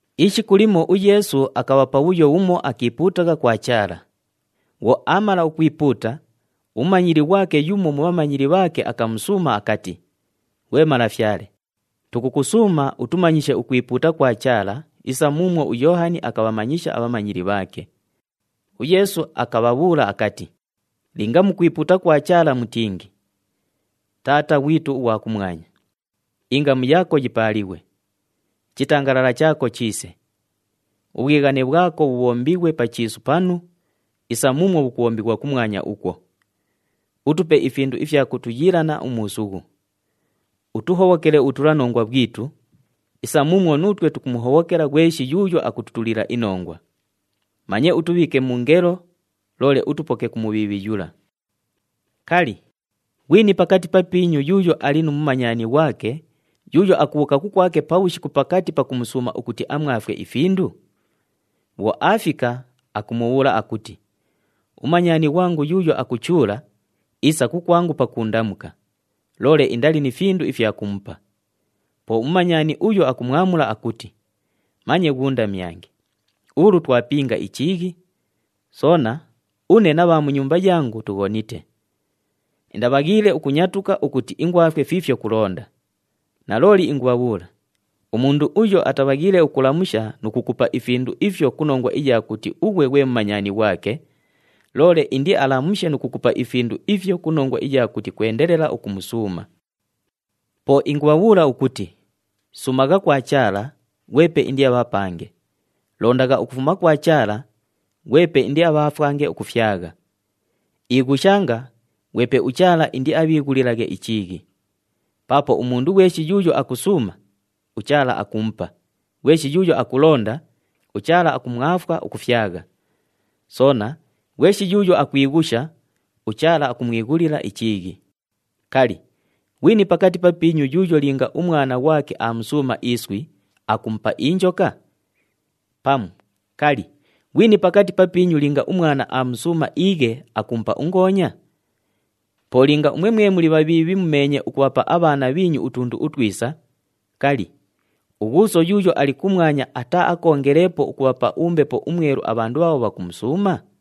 Ishiku limo uYeesu akabha pabhuyo bhumo akiipuutagha kwa Chaala. Bhwo aamala ukwipuuta, umumanyili ghwake yumo mu bhamanyili bhaake akamusuuma akati, “Ghwe Malafyale, tukukusuuma utumanyishe ukwipuuta kwa Chaala isa muumwo uYoohani akabhamanyisha abhamanyili bhaake.” UYeesu akabhabhuula akati, “Linga mukwipuuta kwa Chaala mutingi, ‘Taata [ghwitu ughwa kumwanya], ingamu yaako yipaalighwe. Ichitangalala chaako chiise. [Ubhwighane bhwako bhubhombighwe pa chiisu panu, isa muumwo bhukubhombighwa kumwanya ukwo.] Utupe ifindu ifya kutuyiilana umuusughu. Utuhobhokele ubhutulanongwa bhwitu, isa muumwo nuutwe tukumuhobhokela ghweshi yuuyo akututulila inongwa. Manye utubhiike mu ngelo, [loole utupoke ku Mubhiibhi yula].’ “Kali, ghwini pakati papiinyu yuuyo ali nu mumanyani ghwake, yuuyo akubhuuka kukwake pabhushiku pakati pakumusuuma ukuti amwafwe ifindu? Bhwo aafika, akumubhuula akuti, ‘Umumanyani ghwangu yuuyo akuchuula, iisa kukwangu pakuundamuka, loole indali ni findu ifya kumupa.’ Po umumanyani uyo akumwamula akuti, ‘Manye ghuundamyange! Ulu twapinga ichiighi! Soona, une na bha mu nyumba yangu tughonite. Indabhaghiile ukunyatuka ukuti ingwafwe fiifyo kulonda.’ Nalooli ingubhabhuula, umundu uyo atabhaghiile ukulamusha nu kukupa ifindu ifyo ku nongwa iya kuti ughwe ghwe mumanyani ghwake, loole indialamushe nu kukupa ifindu ifyo ku nongwa iya kuti kwendelela ukumusuuma. “Po ingubhabhuula ukuti, suumagha kwa Chaala, ghwepe indiabhapange. Londagha ukufuma kwa Chaala, ghwepe indiabhaafwange ukufyagha. Ighushanga, ghwepe uChaala indiabhiighulilaghe ichiighi. Paapo umundu ghweshi yuuyo akusuuma, uChaala akumupa, ghweshi yuuyo akulonda, uChaala akumwafwa ukufyagha. Soona, ghweshi yuuyo akwighusha, uChaala akumwighulila ichiighi. Kali, ghwini pakati papiinyu yuuyo linga umwana ghwake aamusuuma iswi, akumupa injoka? Pamu kali, ghwini pakati papiinyu linga umwana aamusuuma iighe, akumupa ungoonya? Po linga umwe mwe muli bhabhiibhi mumeenye ukubhapa abhaana bhiinyu utundu utwisa, kali, uGhuuso yuuyo ali kumwanya ataaakoongeleepo ukubhapa uMbepo uMwelu abhandu bhaabho bhakumusuuma?”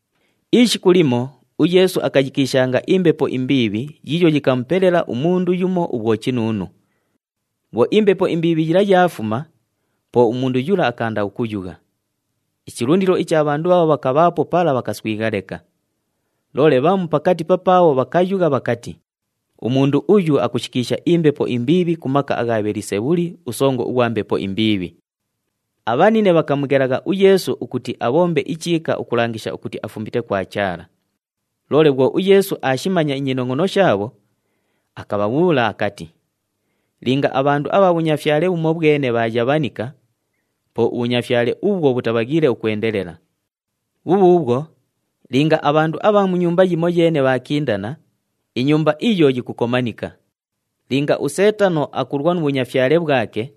Ishiku limo uYeesu akayikiishanga imbepo imbiibhi yiiyo yikamupelela umundu yumo ubhwochinuunu. Bhwo imbepo imbiibhi yila yaafuma, po umundu yula akaanda ukuyugha. Ichilundilo icha bhandu bhaabho bhakabhaapo pala bhakaswigha leka. Loole bhamu pakati papaabho bhakayugha bhakati, “Umundu uyu akushikiisha imbepo imbiibhi ku maka agha Bhelisebhuli, usongo ughwa mbepo imbiibhi!” Abhanine bhakamughelagha uYeesu ukuti abhombe ichiika ukulangisha ukuti afumite kwa Chaala. Loole bhwo uYeesu aashimanya inyinongʼono shaabho, akabhabhuula akati, “Linga abhandu abha bhunyafyale bhumobhwene bhaayabhanika, po ubhunyafyale ubhwo bhutabhaghiile ukwendelela. Bhubhuubhwo, linga abhandu abha mu nyumba yimoyeene bhaakindana, inyumba iyo yikukomanika. Linga uSeetano akulwa nu bhunyafyale bhwake,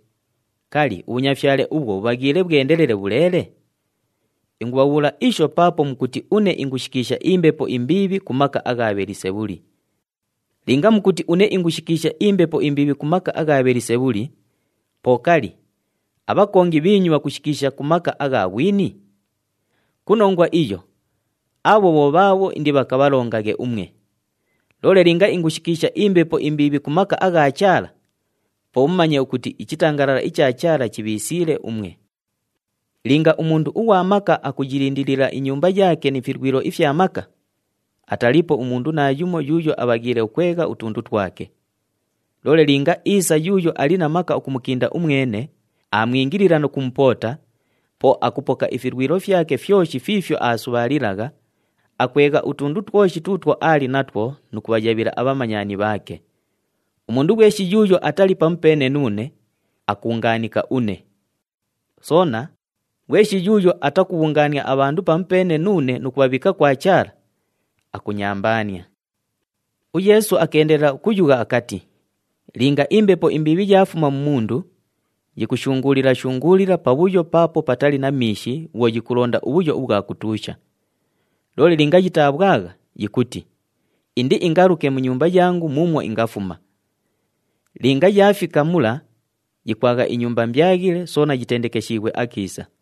kali, ubhunyafyale ubhwo bhubhaghiile bhwendelele bhuleele? Ingubhabhuusha isho paapo mukuti une ingushikiisha imbepo imbiibhi ku maka agha Bhelisebhuli. Linga mukuti une ingushikiisha imbepo imbiibhi ku maka agha Bhelisebhuli, po kali, abhakongi bhiinyu bhakushikiisha ku maka agha ghwini? Ku nongwa iyo, abho bho bhaabho indibhakabhalongaghe umwe. Loole linga ingushikiisha imbepo imbiibhi ku maka agha Chaala, po mumanye ukuti ichitangalala icha Chaala chibhiisiile umwe! “Linga umundu ughwa maka akuyilindilila inyumba yaake ni filwilo ifya maka, ataliipo umundu naayumo yuuyo abhaghiile ukwegha utundu twake. Loole linga iisa yuuyo ali na maka ukumukinda umwene, aamwingilila nu kumupoota, po akupoka ifilwilo fyake fyoshi fiifyo aasubhaalilagha, akwegha utundu twoshi tuutwo aali natwo nu kubhayabhila abhamanyani bhaake. Umundu ghweshi yuuyo atali pamupeene nuune, akuungaanika une. Soona, ghweshi yuuyo atakubhungaania abhandu pamupeene nuune nu kubhabhiika kwa Chaala, akunyambaania.” UYeesu akeendelela ukuyugha akati, “Linga imbepo imbiibhi yaafuma mu mundu, yikushunguulila-shunguulila pabhuyo paapo patali na miishi bhwo yikulonda ubhuyo ubhwa kutuusha. Loole linga yitabhwagha, yikuti, ‘Indiingaluke mu nyumba yangu muumwo ingafuma.’ Linga yaafika mula, yikwagha inyumba mbyaghile soona yitendekeshiighwe akiisa.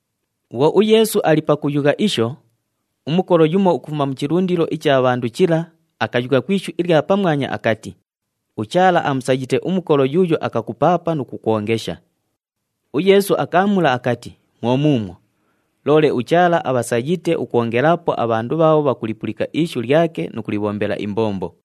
Bhwo uYeesu ali pakuyugha isho, umukolo yumo ukufuma mu chilundilo icha bhandu chila, akayugha ku ishu ilya pamwanya akati, “UChaala amusayite umukolo yuuyo akakupaapa nu kukwongesha!” UYeesu akaamula akati, “Mwo muumwo, loole uChaala abhasayite ukwongelaapo abhandu bhaabho bhakulipulika ishu lyake nu kulibhombela imbombo.”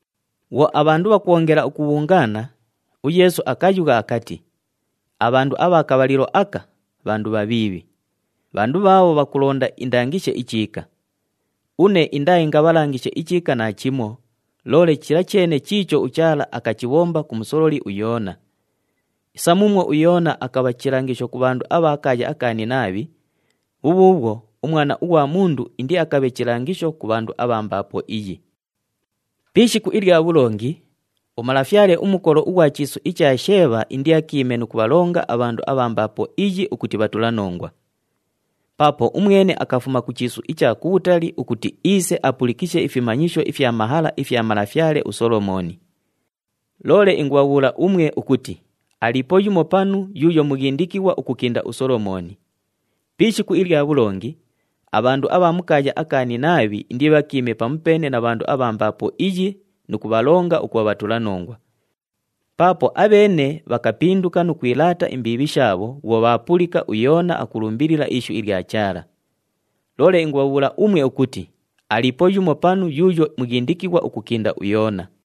Bhwo abhandu bhakwongela ukubhungaana, uYeesu akayugha akati, “Abhandu abha kabhalilo aka, bhandu bhabhiibhi. Bhandu bhaabho bhakulonda indangishe ichiika. Une indaaingabhalangishe ichiika naachimo, loole chila cheene chiicho uChaala akachibhomba ku musololi uYoona. Isa muumwo uYoona akabha chilangisho ku bhandu abha kaaya aka Ninaabhi, bhubhuubhwo, uMwana ughwa Mundu indiakabhe chilangisho ku bhandu abha mbaapo iyi. “Pi ishiku ilya bhulongi, umalafyale umukolo ughwa chiisu icha Sheebha indiakiime nu kubhalonga abhandu abha mbaapo iyi ukuti bhatulanongwa. Paapo umwene akafuma ku chiisu icha kubhutali ukuti iise apulikishe ifimanyisho ifya mahala ifya malafyale uSolomooni. Loole ingubhabhuula umwe ukuti aliipo yumo panu yuuyo mughindikighwa ukukinda uSolomooni. Pi ishiku ilya bhulongi, abhandu abha mu kaaya aka Ninaabhi indibhakiime pamupeene na bhandu abha mbaapo iyi nu kubhalonga ukubha bhatulanongwa. Paapo abheene bhakapinduka nu kwilaata imbiibhi shaabho bhwo bhaapulika uYoona akulumbilila ishu ilya Chaala. Loole ingubhabhuula umwe ukuti aliipo yumo panu yuuyo mughindikighwa ukukinda uYoona.”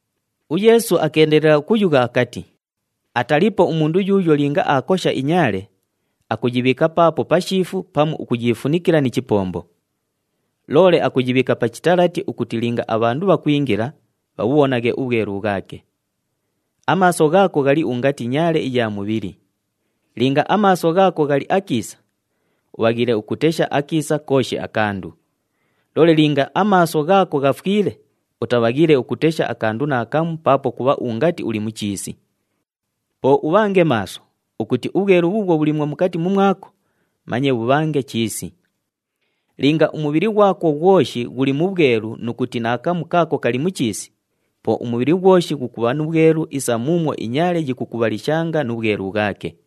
UYeesu akeendelela ukuyugha akati, “Ataliipo umundu yuuyo linga aakosha inyaale, akuyibhiika paapo pashiifu pamu akuyiifunikila ni chipombo. Loole akuyibhiika pa chitalati ukuti linga abhandu bhakwingila, bhabhubhonaghe ubhwelu bhwake. Amaaso ghaako ghali ungati nyaale iya mubhili. Linga amaaso ghaako ghali akiisa, ubhaghiile ukutesha akiisa kooshi akandu. Loole linga amaaso ghaako ghafwile, utabhaghiile ukutesha akandu naakamu paapo kubha ungati uli mu chiisi. Po ubhange maaso ukuti ubhwelu bhuubhwo bhuliimwo mukati mumwako manye bhubhange chiisi! Linga umubhili ghwako ghwoshi ghuli mu bhwelu nu kuti naakamu kaako kali mu chiisi, po umubhili ghwoshi ghukubha nu bhwelu isa muumwo inyaale yikukubhalishanga nu bhwelu bhwake.”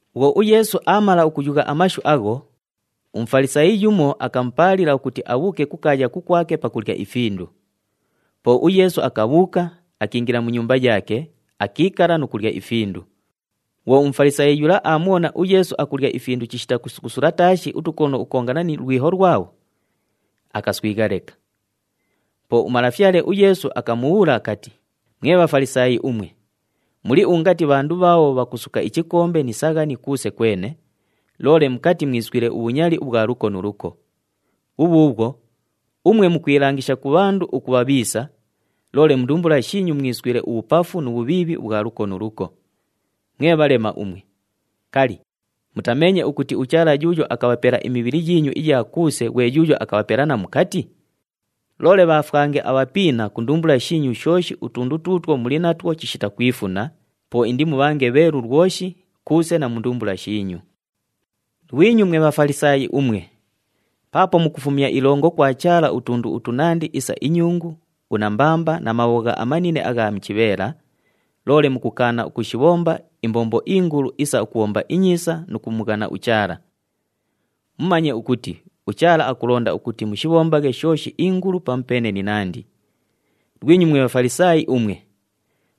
Bhwo uYeesu aamala ukuyugha amashu agho, uMufalisaayi yumo akamupaalila ukuti abhuuke kukaaya kukwake pakulya ifindu. Po uYeesu akabhuuka, akiingila mu nyumba yaake, akiikala nu kulya ifindu. Bhwo uMufalisaayi yula aamubhona uYeesu akulya ifindu chishita kusukusula taashi utukono ukukongana nu lwiho lwabho, akaswigha leka. Po uMalafyale uYeesu akamubhuula akati, “Mwe Bhafalisaayi umwe, muli ungati bhandu bhaabho bhakusuka ichikombe ni saghani kuuse kwene, loole mukati mwiswile ubhunyali ubhwa luko nu luko. Bhubhuubhwo, umwe mukwilangisha ku bhandu ukubha bhiisa, loole mu ndumbula shiinyu mwiswile ubhupafu nu bhubhiibhi ubhwa luko nu luko. Mwe bhalema umwe! Kali, mutameenye ukuti uChaala yuuyo akabhapela imibhili yiinyu iya kuuse ghwe yuuyo akabhapela na mukati? Loole bhaafwange abhapiina ku ndumbula shiinyu shooshi utundu tuutwo muli natwo chishita kwifuna, po indimubhange bheelu lwoshi, kuuse na mu ndumbula shiinyu. “Lwinyu mwe Bhafalisaayi umwe! Paapo mukufumya ilongo kwa Chaala utundu utunandi isa inyungu, unambamba na mabhogha amanine agha mu chibheela, loole mukukaana ukushibhomba imbombo ingulu isa ukubhomba inyiisa nu kumughana uChaala. Mumanye ukuti uChaala akulonda ukuti mushibhombaghe shooshi ingulu pamupeene ni nandi. Lwinyu mwe Bhafalisaayi umwe!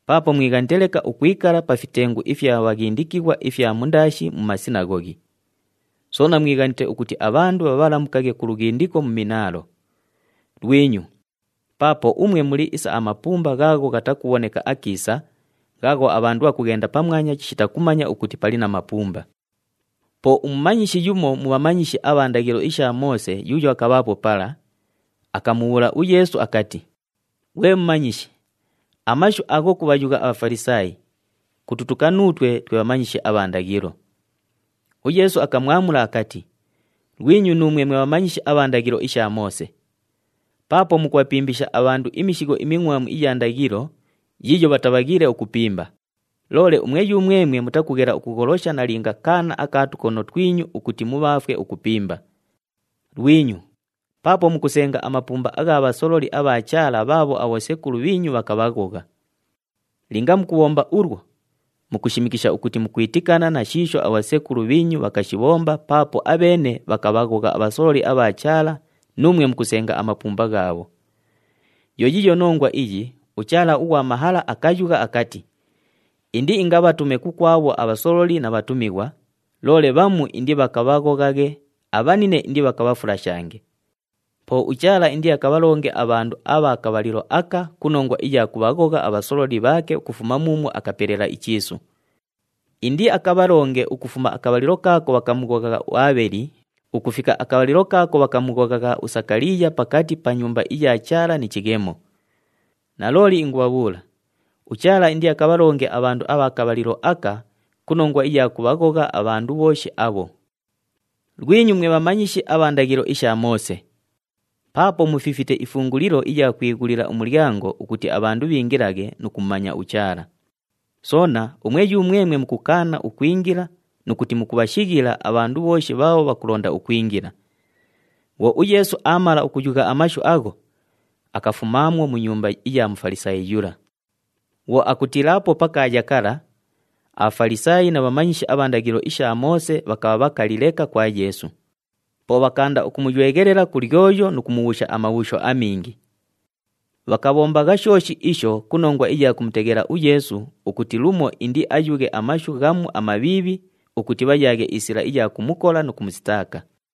Paapo mwighanite leka ukwikala pa fitengu ifya bhaghindikighwa ifya mundaashi mu masinaghoghi. Soona mwighanite ukuti abhandu bhabhalamukaghe ku lughindiko mu minaalo. Lwinyu! Paapo umwe muli isa amapumba ghaagho ghatakubhoneka akiisa, ghaagho abhandu bhakughenda pamwanya chishita kumanya ukuti pali na mapumba.” Po umumanyishi yumo mu bhamanyishi abha ndaghilo isha Moose yuuyo akabhaapo pala, akamubhuula uYeesu akati, “Ghwe Mumanyishi, amashu agho kubhayugha aBhafalisaayi, kututuka nuutwe twe bhamanyishi abha ndaghilo.” UYeesu akamwamula akati, “Lwinyu nuumwe mwe bhamanyishi abha ndaghilo isha Moose! Paapo mukubhapimbisha abhandu imishigho imingʼwamu iya ndaghilo yiiyo bhatabhaghiile ukupimba, loole umwe yumwemwe mutakughela ukugholosha nalinga kaana aka tukono twinyu ukuti mubhaafwe ukupimba! Lwinyu! Paapo mukusenga amapumba agha bhasololi abha Chaala bhaabho abhosekulu bhiinyu bhakabhaghogha! Linga mukubhomba ulwo, mukushimikisha ukuti mukwitikana na shiisho abhosekulu bhiinyu bhakashibhomba paapo abheene bhakabhaghogha abhasololi abha Chaala nuumwe mukusenga amapumba ghaabho! Yo yiiyo nongwa iyi uChaala ughwa mahala akayugha akati, ‘Indiingabhatume kukwabho abhasololi na bhatumighwa, loole bhamu indibhakabhaghoghaghe, abhanine indibhakabhafulashange.’ Po uChaala indiakabhalonge abhandu abha kabhalilo aka ku nongwa iya kubhaghogha abhasololi bhaake ukufuma muumwo akapelela ichiisu. Indiakabhalonge ukufuma akabhalilo kaako bhakamughoghagha uAabheli ukufika akabhalilo kaako bhakamughoghagha uSakaliiya pakati pa Nyumba iya Chaala ni chighemo. Nalooli ingubhabhuula, uChaala indiakabhalonge abhandu abha kabhalilo aka ku nongwa iya kubhaghogha abhandu bhooshi abho. “Lwinyu mwe bhamanyishi abha ndaghilo isha Moose! Paapo mufifite ifungulilo iya kwighulila umulyango ukuti abhandu bhiingilaghe nu kumumanya uChaala. Soona, umwe yumwemwe mukukaana ukwingila nu kuti mukubhashighila abhandu bhooshi bhaabho bhakulonda ukwingila.” Bhwo uYeesu aamala ukuyugha amashu agho, akafumaamwo mu nyumba iya Mufalisaayi yula. Bhwo akutiilaapo pa kaaya kala, aBhafalisaayi na bhamanyishi abha ndaghilo isha Moose bhakabha bhakali leka kwa Yeesu. Po bhakaanda ukumuyweghelela ku lyoyo nu kumubhuusha amabhuusho amingi. Bhakabhombagha shooshi isho ku nongwa iya kumuteghela uYeesu ukuti lumo indiayughe amashu ghamu amabhiibhi ukuti bhayaaghe isila iya kumukola nu kumusitaaka.